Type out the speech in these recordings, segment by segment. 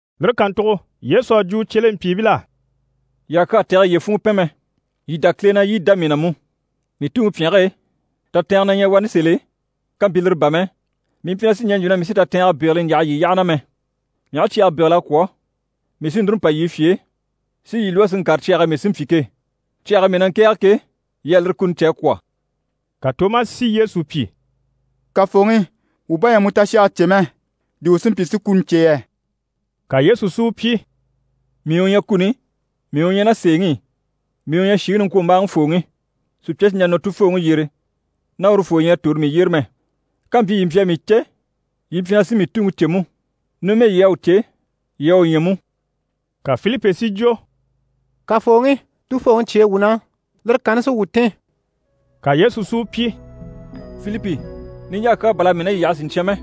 Lire kàntugo Yesu à jwo u cyelempyiibil'á: «Yii àha kyaa tɛ̀gɛ yiye funŋɔ pɛn mɛ. Yii dá Kile na, yii dá mii na mú. Mii Tuŋi pyɛnge e, tatɛɛngɛ na ɲyɛ wani sèl'e, kàmpyi lire bà mɛ, mii mpyi na sì ɲɛɛ n‑jwo na mii sí tatɛɛngɛ bégele n‑yaha yii yyaha na mɛ. Mii aha cyage bégel'a kwɔ̀, mii sí núru n‑pa yii fye e, si yii lwɔ́ si ŋkàre cyage e mii sí n‑pyi ke. Cyage e mii na ŋkɛ̀ɛge ke, yii à lire kuni cè a kwɔ̀.» Ka Tomasi si Yesu pyi: «Kafooŋi, wuu bá ɲyɛ a mu tashage cè mɛ, di wuu sí n‑pyi si kuni cè yɛ?» Ka Yesu si u pyi: «Mii u ɲyɛ kuni, mii u ɲyɛ ná sèeŋi i, mii u ɲyɛ shìŋi niŋkwombaaŋifooŋi. Sùpya sì n‑jà nɔ Tufooŋi yyére ná urufoo ɲyɛ a tòro mii yyére mɛ. Kàmpyi yii mpyi a mii cè, yii mpyi na sí mii Tuŋi cè mú. Numɛ yii à u cè, yii à u ɲya mú.» Ka Filipi si jwo: «Kafooŋi, Tufooŋi cyêe wuu na, lire kanni sí wuu tìn.» Ka Yesu si u pyi: «Filipi, niɲjaa kyaa bà l'à mii ná yii yaha siɲcyan mɛ,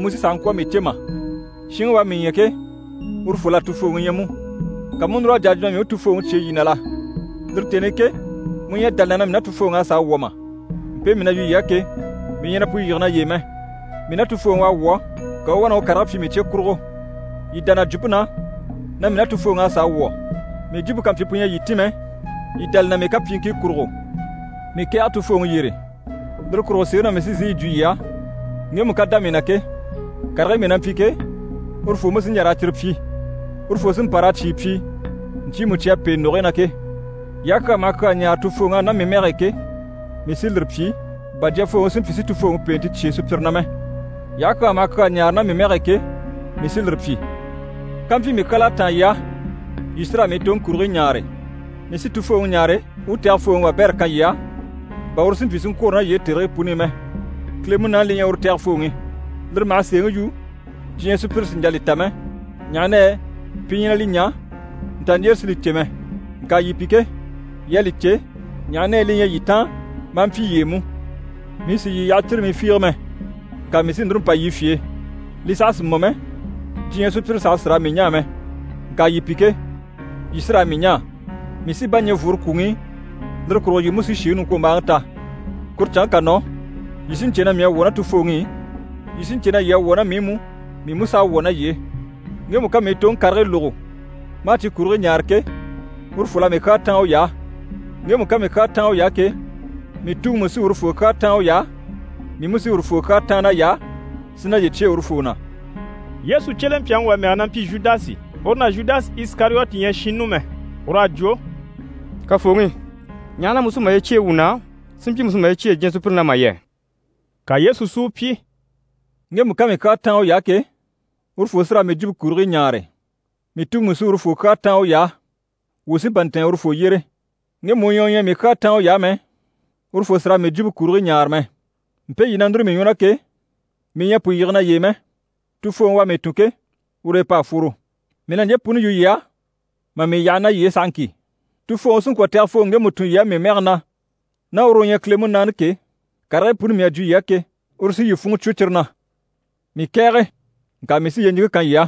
mu sí sàha ŋkwɔ̀ a mii cè mà? Shinŋi u à mii ɲya ke, urufol'à Tufooŋi ɲya mú. Ka mu u núr'a jà a jwo na mii u Tufooŋi cyêe yii na la? Lire tèni i ke, mu ɲyɛ a dá li na na mii ná Tufooŋi à sàa wwɔ̀ mà? Mpe mii na yu yii á ke, mii ɲyɛ na pu yige naye e mɛ. Mii ná Tufooŋi u à wwɔ̀, ka u u wá na u karigii pyi mii cye kurugo. Yii dá na jwumpe na na mii ná Tufooŋi a sàa wwɔ̀. Mii jwumpe ká mpyi pu ɲyɛ a yii tìn mɛ, yii dá li na mii kapyiiŋkii kurugo. Mii kɛ̀ɛge Tufooŋi yyére, lire kurugo sèeŋi na mii sí n‑sìi yi jwo yii á, ŋgemu ká dá mii na ke, karigii mii na mpyi ke, urufoo mú sí n‑jà raa cyire pyi, urufoo sí n‑pa raa cyìi pyi ɲcyiimu cyi à pêe ndògogii na ke. Yii aha kyaa maha kyaa ɲáare Tufooŋi á ná mii mɛge e ke, mii sí lire pyi, bà Jyafooŋi si mpyi si Tufooŋi pèente cyêe sùpyire na mɛ. Yii aha kyaa maha kyaa ɲáare ná mii mɛge e ke, mii sí lire pyi. Kampyi mii kyal'à táan yii á, yii sí raa mii toŋi kurigii ɲaare. Mii sí Tufooŋi ɲáare u u Tɛgɛfooŋi wabɛrɛ kan yii á, bà uru si mpyi si ŋkwôro ná yii e tèrigii puni i mɛ. Kile Munaani li ɲyɛ uru Tɛgɛfooŋi. Lire maha sèeŋi yu, diɲyɛ sùpyire sì n‑jà li ta mɛ, ɲaha na yɛ pi ɲyɛ na li ɲaa, nta ɲjyére si li cè mɛ. Ŋka yii pi ke, yii à li cè, ɲaha na yɛ li ɲyɛ yii taan maa mpyi yii e mú. Mii sì yii yaha círimii fiige mɛ. Ŋka mii sí núru n‑pa yii fye e. Li saha sì mɔ mɛ, diɲyɛ sùpyire saha sì raa mii ɲaa mɛ, ŋka yii pi ke, yii sí raa mii ɲaa. Mii sí bá ɲɛ̀ n‑fworo kwùŋi i, lire kurugo yii mú sí shìŋi niŋkwombaaŋi ta. Kuru canŋke ká nɔ, yii sí n‑cè na mii à wwɔ̀ ná Tufooŋi i, yii sí n‑cè na yii à wwɔ̀ ná mii i mú, mii mú s'à wwɔ̀ ná yii e. Ŋgemu ká mii toŋi karigii lógo, maa cyi kurigii ɲaare ke, urufol'à mii kyaa táan uy'á. Ŋgemu ká mii kyaa táan uy'á ke, mii Tuŋi mú sí urufoo kyaa táan uy'á, mii mú sí urufoo kyaa táan nay'á, si naye cyêe urufoo na.» Yesu cyelempyaŋi wà mɛge na mpyi Zhudasi, uru ná Zhudasi Isikariyoti ɲyɛ shinnu mɛ, ur'à jwo: «Kafooŋi, ɲaha na mu sí maye cyêe wuu na, si mpyi mu sì maye cyêe diɲyɛ sùpyire na mà yɛ?» Ka Yesu si u pyi: «Ŋgemu ká mii kyaa táan uy'á ke, urufoo sí raa mii jwumpe kurigii ɲaare. Mii Tuŋi mú sí urufoo kyaa táan uy'á. Wuu sí n‑pa n‑tɛ̀ɛn urufoo yyére. Ŋgemu u ɲyɛ u ɲyɛ a mii kyaa táan uy'á mɛ, urufoo sì raa mii jwumpe kurigii ɲaare mɛ. Mpe yii na núru mii ɲwɔ na ke, mii ɲyɛ a pu yige naye e mɛ, Tufooŋi u à mii tun ke, ur'e p'à fworo. Mii na ɲje puni yu yii á, mà mii yaha ná yii e sahaŋki. Tufooŋi sí n‑kwɔ̀ Tɛgɛfooŋi ŋgemu tun yii á mii mɛge na, ná uru u ɲyɛ Kile Munaani ke, karigii puni mii à jwo yii á ke, uru sí yii funŋɔ cwo cyire na. Mii kɛ̀ɛge, ŋka mii sí yyeɲiŋke kan yii á.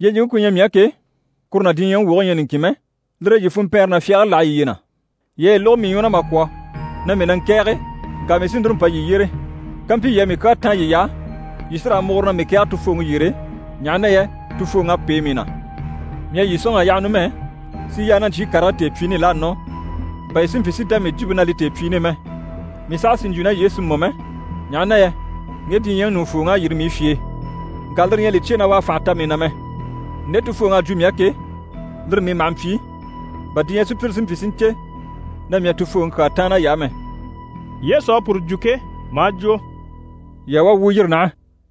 Yyeɲiŋke ku ɲyɛ mii á ke, kuru ná diɲyɛŋi woge ɲyɛ niŋkin mɛ, lire e yii funmpɛɛnre ná fyagare láha yiye na. Yii à yi lógo mii ɲwɔ na mà kwɔ̀ na mii na ŋkɛ̀ɛge, ŋka mii sí núru n‑pa yii yyére. Kampyi yii à mii kyaa táan yiy'á, yii sí raa múgure na mii kɛ̀ɛge Tufooŋi yyére, ɲaha na yɛ Tufooŋ'à pêe mii na. Mii à yii sɔ̂nŋ'a yaha numɛ, si yaa ná ɲcyii karigii tèepyiini i l'à nɔ, bà yii si mpyi si dá mii jwumpe na li tèepyiini i mɛ. Mii saha sì n‑jwo ná yii e si mɔ mɛ, ɲaha na yɛ ŋge diɲyɛŋi ɲùŋufooŋ'à yîri mii fye e. Ŋka lire ɲyɛ a li cyêe na u à fànha ta mii na mɛ. Nde Tufooŋi à jwo mii á ke, lire mii maha mpyi, bà diɲyɛ sùpyire si mpyi si ɲcè na mii à Tufooŋi kyaa táan nay'á mɛ.» Yesu à puru jwo ke, maa jwo: «Yii a wá, wuu yîri naha.»